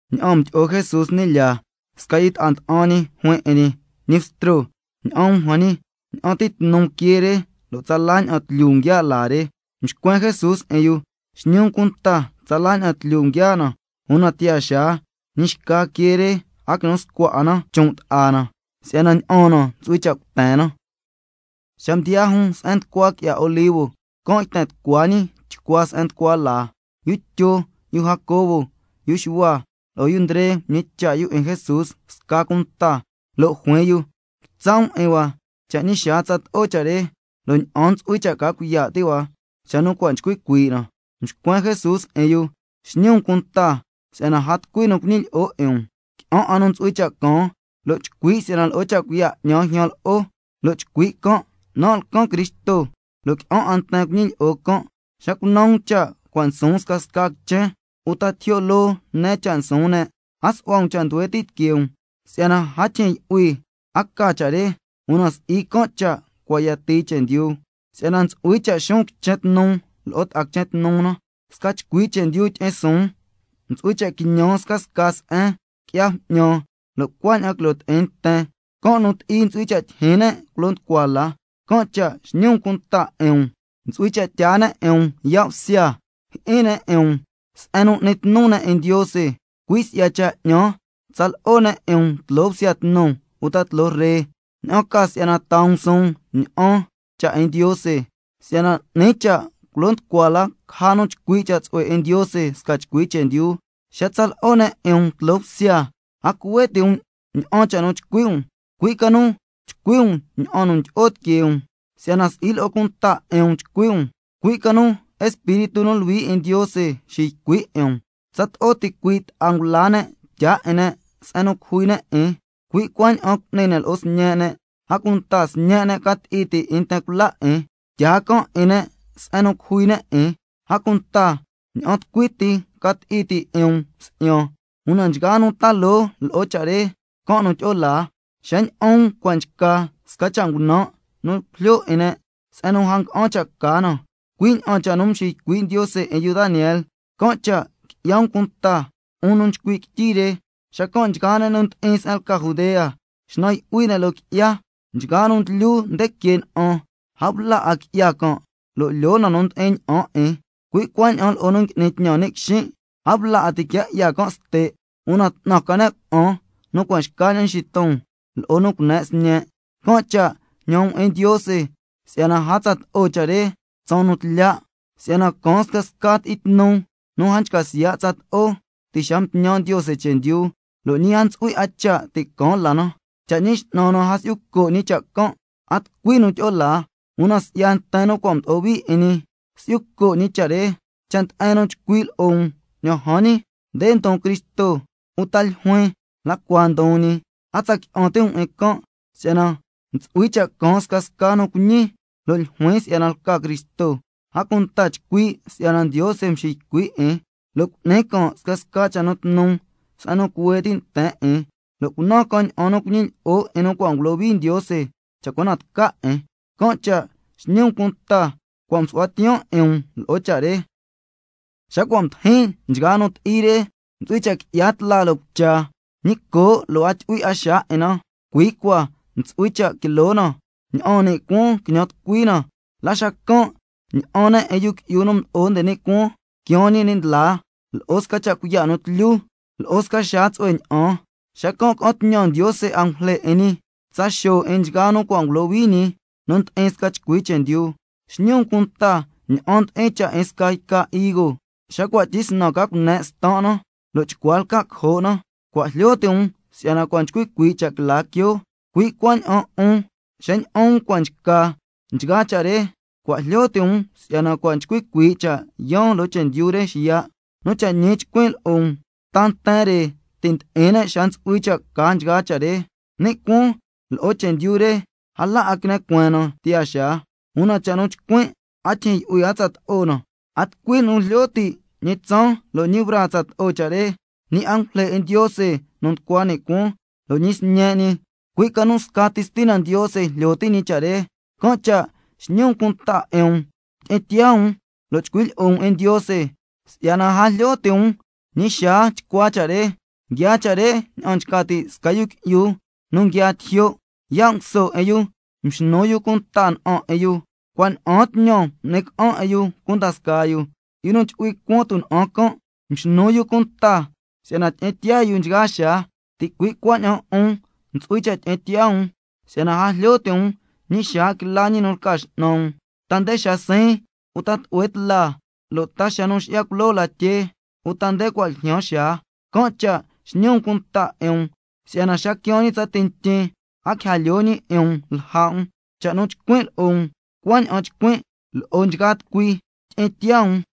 Ña'an mdo'o Jesús ni' lyaa, sca yu ta'a nda'an ñi juin lo'o ñi: Ñi Bstro, ña'an um jan ñi, ña'an ti tnu quee re lo' tsala ña'an tlyu nguiaa' laa re. Mxcuen Jesús 'in yu: Xñi cunta tsala ña'an tlyu nguiaa' na, una tiyaa xaa ñi xca quee re a quinu scua 'a na chon' ta'a na, si'yana ña'aan na ntsu'hui cha' cuten na. Xa mdiyaa jun se'en nducua qui'ya Olivo, can' yten tucua ñi chcua se'en nducua laa. Yu Tyo, yu Jacobo, yu Xuhua, lo'o yu Ndre mñicha' yu 'in Jesús sca cunta, lo' juin yu: Quitsa' um 'in hua cha' ñi xaa tsato'o cha' re, lo' ña'an ntsu'hui cha' ca cuiya' ti' hua xa nu cua' nchcui cuii' na? Mxcuen Jesús 'in yu: Xñi um cunta si'yana a tucui nu cuñilyi'o 'in um. Qui'an 'a nu ntsu'hui cha' caan lo' chcui' si'yana lo'o cha' cuiya' 'ñan ljyan lo'o, lo' chcui' can': Nan' lcan Cristo. Lo' qui'an 'a nten cuñilyi'o can'. Xa cunan um cha' cua' nsuun scasca quichen, uta tijyo' loo ne cha' nsuun ne', a su'hua um cha' nduhue ti' tiquee um, si'yana a tyijyin yu'hui nu a ca cha' re, una si'i can' cha' cua' tsatii chendyu. Si'yana ntsu'hui cha' xuun quichen tnu lo'o ta'a quichen tnu na, sca chcui chendyu tyi'in suun. Ntsu'hui cha' quiñan scasca se'en, qui'ya bju'ñan, lo' cuaña'an quilo ti'in nten. Can' nu ti'i ntsu'hui cha' tyijyin ne' culo nducua la. Can' cha' xñi um cunta 'in um. Ntsu'hui cha' tyaa ne' 'in um yaa' bsya, jyi'in ne' 'in um se'en nu n'ni tnu ne' 'in Ndiose. Cui' si'ya cha' 'ñan tsa lo'o ne' 'in um tloo bsya tnu uta tloo ree, ña'an ca si'yana taa um suun ña'an cha' 'in Ndiose, si'yana 'ni cha' culo nducua la caja nu chcui' cha' tsu'hue 'in Ndiose sca chcui chendyu. Xa tsa lo'o ne' 'in um tloo bsya, a cuhue ti' um ña'an cha' nu chcui' um, cui' ca nu chcui' um ña'an cha' nu tyi'o tiquee um, si'yana si'i lo'o cunta 'in um chcui' um, cui' ca nu Espíritu nu Luhui 'in Ndiose xiycui' 'in um. Tsato'o ticui' ta'a ngula ne' tyaa 'in ne' se'en nu cujui ne' 'in, cui' cuaña'an cu'ni ne' lo'o sñe' ne', a cunta sñe' ne' ca ti'i ti' 'in nten cula 'in, tyaa can' 'in ne' se'en nu cujui ne' 'in. A cunta ña'an tucui ti ca ti'i ti' 'in um si'yan, una nchgaa nu ta loo lo'o cha' re, can' nu tyi'o laa. Xa ña'an um cua' nchca —sca cha' ngunan' nu cujlyo 'in ne' se'en nu a nga'an cha' ca na—, cui' ña'an cha' nu mxiycui' Ndiose 'in yu Daniel, (can' cha' qui'ya um cunta, 'un nu nchcui' quityi re), xacan' nchgaa ne' nu ndi'in se'en lca Judea, xnan yu'hui ne' loo qui'ya. Nchgaa nu nguilyu nde que na'an, a bla 'a qui'ya can', lyoo na nu ndi'in ña'an 'in. Cui' cuaña'an lo'o nu ngui'ni tñan ni' quixin', a bla 'a ti' quia 'ya can' ste'. Una 'tnan ca ne' cuna'an nu cua' xcaña'an nxiton, lo'o nu cune' sñe'. Can' cha' jñan um 'in Ndiose si'yana a tsato'o cha' re tsaan nu ndi'ya ti'in tlya'. Si'yana caan —scasca nu ti'i tnu, nu a nchca siya' tsato'o ti' xa mtñan Ndiose chendyu, lo' ñi a ntsu'hui 'a cha' ti' caan la na—. Cha' Ñi X'nan na a si'yu co' ñi cha' can', a tucui nu tyi'o laa, una si'ya nten nu cua' mdo'o hui 'in ñi, can' cha' si'yu co' ñi cha' re. Cha' nde'en nu chcui' lo'o um: Ña'an jan ñi, nde ndon Cristo, uta ljuin: La cua ndon ñi. A tsa qui'an ti' um 'in can'. Si'yana ntsu'hui cha' caan scasca nu cuiñi lo' ljuin si'yana lca Cristo, a cunta chcui' si'yana Ndiose nxiycui' 'in, lo' cu'ni can' scasca cha' nu tnu se'en nu cuhue ti' nten 'in, lo' cunan can' ña'an nu cuñilyi'o 'in nu cua' ngulohui Ndiose, cha' cua na tca 'in. Can' cha' xñi um cunta 'in um, cua' msu'huan tiyaan 'in um lo'o cha' re. Xa cua' mdijin nchgaa nu ti'i re, —ntsu'hui cha' qui'ya tla loo cucha, ñi coo' lo' a tyu'hui 'a xaa 'in na. Cuii cua ntsu'hui cha' quilo na, ña'aan ni' cuaan quiñan tucui na—. La xacan' ña'an ne' 'in —Yu Qui'yu nu Mdo'o nde ni' Cuaan quiaan ñi ni' ndlaa— lo'o sca cha' cuiya' nu tlyu lo'o sca xaa tsu'hue ña'an. Xacan' ca'an tñan Ndiose angujle 'in ñi, tsa xo' 'in nchgaa nu cua' ngulohui ñi nu ndi'in sca chcui chendyu. Xñi um cunta ña'an ndi'in cha' 'in sca yca higo xa cua' tyisnan ca cune' stan' na, lo' chcua lca' cojo' na, cua' jlyo ti' um si'yana cua' nchcui cuii' cha' quila quioo. Cui' cuaña'an 'un xa ña'an um cua' nchca nchgaa cha' re, cua' jlyo ti' um si'yana cua' nchcui cuii' cha' yaan loo chendyu re xiya'. Nu cha' ñi chcuin' lo'o um, ta nten re ti' ndi'in ne' xa ntsu'hui cha' ca nchgaa cha' re. Ni' cuaan lo'o chendyu re, a la 'a quine cueen na tiyaa xaa, una cha' nu nchcuin' a tyijyin yu'hui a tsato'o na. A tucui nu jlyo ti' ñi tsaan lo' ñi braa tsato'o cha' re, ñi angujle 'in Ndiose nu nducua ni' cuaan, lo' ñi Sñe' ñi, cui' ca nu scati Stina Ndiose jlyo ti' ñi cha' re. Can' cha' xñi um cunta 'in um, tyi'in tiyaa um, lo' chcui' lyi'o um 'in Ndiose, si'yana a jlyo ti' um ñi xaa tsato'o cha' re. Nguiaa cha' re ña'an nchca ti' sca yu qui'yu nu nguiaa tijyo', yaa' nguso 'in yu mxnu yu cunta na'an 'in yu, cua' ña'aan tñan m'ni ca'an 'in yu cunda scaa yu, lo' yu nu chu'hui cuan tuna'an can', mxnu yu cunta si'yana tyi'in tiyaa yu nchgaa xaa. Ticui' cuaña'an 'un ntsu'hui cha' tyi'in tiyaa um, si'yana a jlyo ti' um ñi xaa quila ñi nu lca x'nan um, ta nde xa siin, uta tlu'hue tla, lo' ta xa nu nxi'ya culoo latyee, uta nde cua' ljyaan xaa. Can' cha' xñi um cunta 'in um, si'yana xa quiaan ñi tsati ntyin, a quija lyoo ñi 'in um lja' um. Cha' nu nchcuin' lo'o um, cuaña'an nchcuin' lo'o nchgaa tucui: Tyi'in tiyaa um.